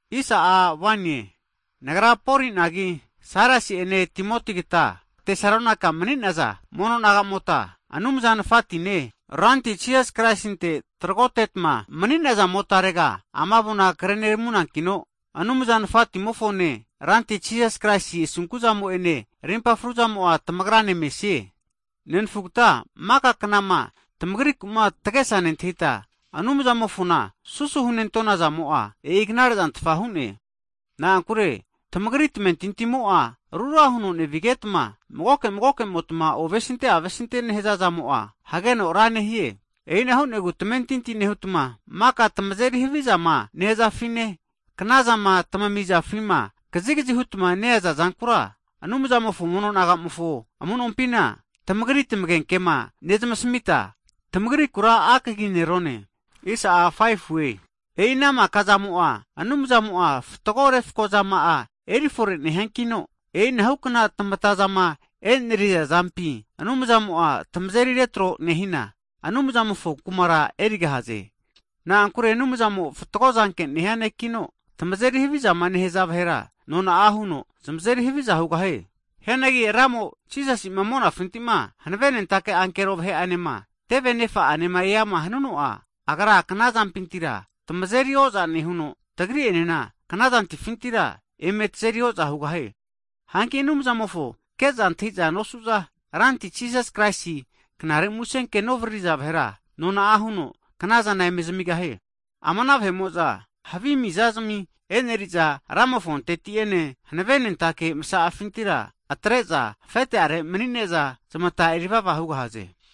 Hagi nagra Poli'nagi Sailasi'ene Timotigata Tesalonaika mani'naza mono nagamota Anumza Nafatine, Ranti Jisas Kraisinte tragotetma mani'nazamotarega, ama avona kre'neramunankino, Anumza Nafatimofone, Ranti Jisas Kraisi Asunku'zamo'ene rimpa fruzamo'a tamagrane mesie. Hagi nenfugata maka knama tamagriku'ma tagesa nentahita Anumzamofona susu hunentona zamo'a, e'i knare'zantfa hu'ne. Na'ankure tamagri tamentintimo'a rura huno nevigetma, magoke magokemotma ovesinte avesintema nehaza zamo'a hageno ra nehie. E'ina hu'negu, tamentinti nehutma, maka tamazeri havizama nehazafine, knazama tamizafima kazikazi hutama neaza zankura, Anumzamofo mono nagamofo amu'nompina tamagri tamagenkema nezamasamita, tamagrikura husaga huneramante'na akaginerone. E'i ana maka'zamo'a Anumzamo'a fatgo refko zama'a erifore nehiankino, e'inahukna tamatazama e'neriza zampi Anumzamo'a tamazeri retro nehina, Anumzamofo kumara erigahaze. Na'ankure Anumzamo'a fatgo zanke nehia Nekino, tamazeri havizama nehaza vahera, nona'a huno zamazeri haviza hugahie. Hianagi Ramo Jisasi'ma monafintima hanavenentake ankero vahe'anema, teve anefa'ane eama hanuno'a, Agra kanazampintira tamazeri o'za nehuno, tagri'enena knazantifintira eme tazeri o'za hugahie. Hanki Anumzamofoma ke'za antahiza nosuza, Ranti Jisas Kraisi Knare Kusenkema novaririza vahera, nona'a huno knazana eme zamigahie. Ama ana vahe'mo'za havi mizazami e'neriza, Ramofonteti'ene hanavenentake masa'afintira atre'za afete'are mani'ne'za, zamata erivava hugahaze.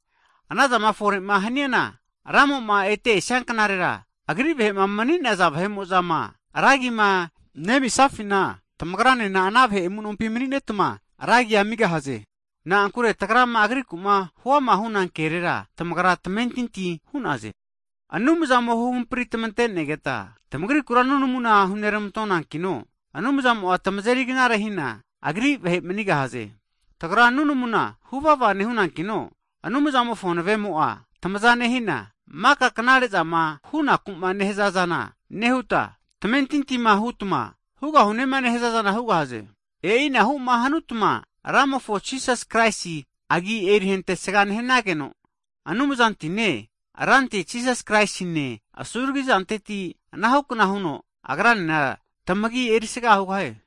Anazama fore'ma haniana Ramoma ete esianknarera Agri vahe'ma mani'naza vahe'mo'zama ra agima nemisafina, tamagranena ana vahe amu'nompi maninetma, ra agi amigahaze. Na'ankure tagrama Agriku'ma huama hu'na kerera, tamagra tamentinti hu'naze. Hagi Anumzamo huhampri tamantenegeta tamagrikura nunamuna huneramantonankino, Anumzamo'a tamazeri knare hina, Agri vahe manigahaze. Tagra nunamuna huvava nehunankino, Anumzamofo hanavemo'a tamaza nehina, maka knare'zama hunaku'ma nehaza zana nehuta, tamamentinti hutma hugahunema nehazazana hugahaze. E'inahuma hanutma Ramofo Jisas Kraisi Agi erihentesga nehnageno, Anumzantine Ranti Jisas Kraisi'enena asunkuzama'areti tamagi erisaga hugahie.